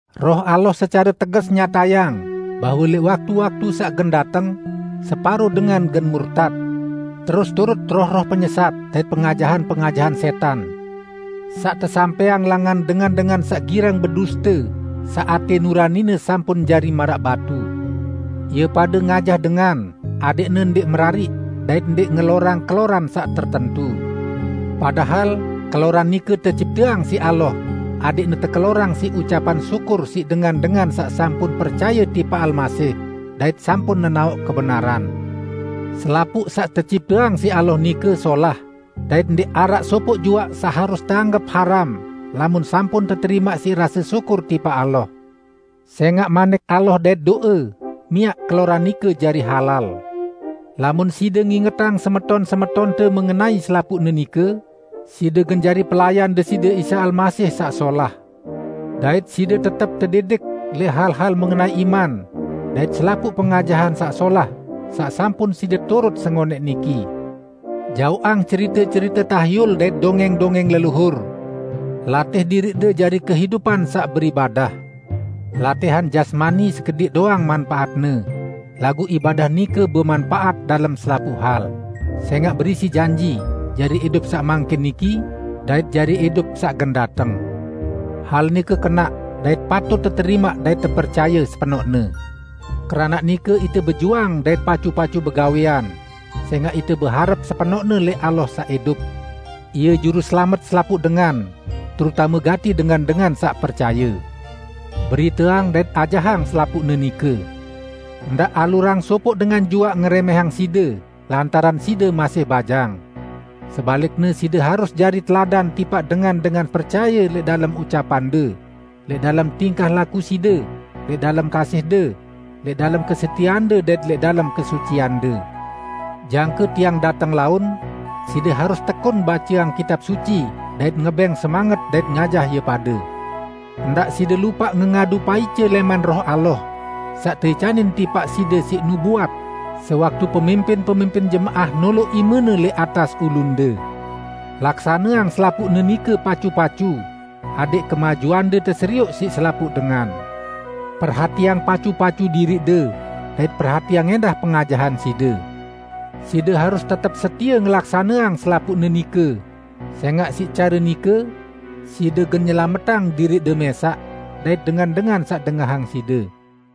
Roh Allah secare teges nyatayang bahwe lẽq waktu-waktu saq gen dateng, separo dengan gen murtat, terus turut roh-roh penyesat dait pengajahan-pengajahan sẽtan, saq tesampẽang langan dengan-dengan saq girang beduste saq atẽ nuranine sampun jari maraq batu. Ie pade ngajah dengan adẽqne ndẽq merariq dait ndẽq ngelorang keloran saq tertentu. Padahal keloran nike tecipteang siq Allah adẽqne tekelorang siq ucapan syukur siq dengan-dengan saq sampun percaye tipaq Almasih dait sampun nenaoq kebenaran. Selapuq saq tecipteang siq Allah nike solah, dait ndẽq araq sopoq juaq saq harus teanggep haram lamun sampun teterimaq siq rase syukur tipaq Allah. Sẽngaq Manik Allah dait do'e miaq keloran nike jari halal. Lamun side ngingetang semeton-semetonte mengenai selapuqne nike, side gen jari pelayan Deside Isa Almasih saq solah. Dait side tetep tedidik lẽq hal-hal mengenai iman dait selapuq pengajahan saq solah saq sampun side turut sengonẽq niki. Jaoqang cerite-cerite tahyul dait dongẽng-dongẽng leluhur. Latih diriqde jari kehidupan saq beribadah. Latihan jasmani sekediq doang manpaatne, laguq ibadah nike bemanpaat dalem selapuq hal, sẽngaq berisi janji, jari idup saq mangkin niki dait jari idup saq gen dateng. Hal nike kenaq dait patut teterimaq dait tepercaye sepenoqne. Keranaq nike ite bejuang dait pacu-pacu begawẽan, sẽngaq ite beharep sepenoqne lẽq Allah saq idup; Ie Juruselamet selapuq dengan, terutame gati dengan-dengan saq percaye. Beriteang dait ajahang selapuqne nike. Ndaq alurang sopoq dengan juaq ngerẽmẽhang side lantaran side masih bajang. Sebalikne, side harus jari teladan tipaq dengan-dengan percaye lẽq dalem ucapande, lẽq dalem tingkah laku side, lẽq dalem kasihde, lẽq dalem kesetieande dait lẽq dalem kesuciande. Jangke tiang dateng laun, side harus tekun baceang Kitab Suci dait ngebẽng semanget dait ngajah ie pade. Ndaq side lupaq ngengadu paice lẽman Roh Allah saq teicanin tipaq side siq nubuat sewaktu pemimpin-pemimpin jemaah noloq imene lẽq atas ulunde. Laksaneang selapuqne nike pacu-pacu adẽq kemajuande teserioq siq selapuq dengan. Perhatiang pacu-pacu diriqde dait perhatiang ẽndah pengajahan side. Side harus tetep setie ngelaksaneang selapuqne nike, sẽngaq siq care nike side gen nyelametang diriqde mẽsaq dait dengan-dengan saq dengahang side.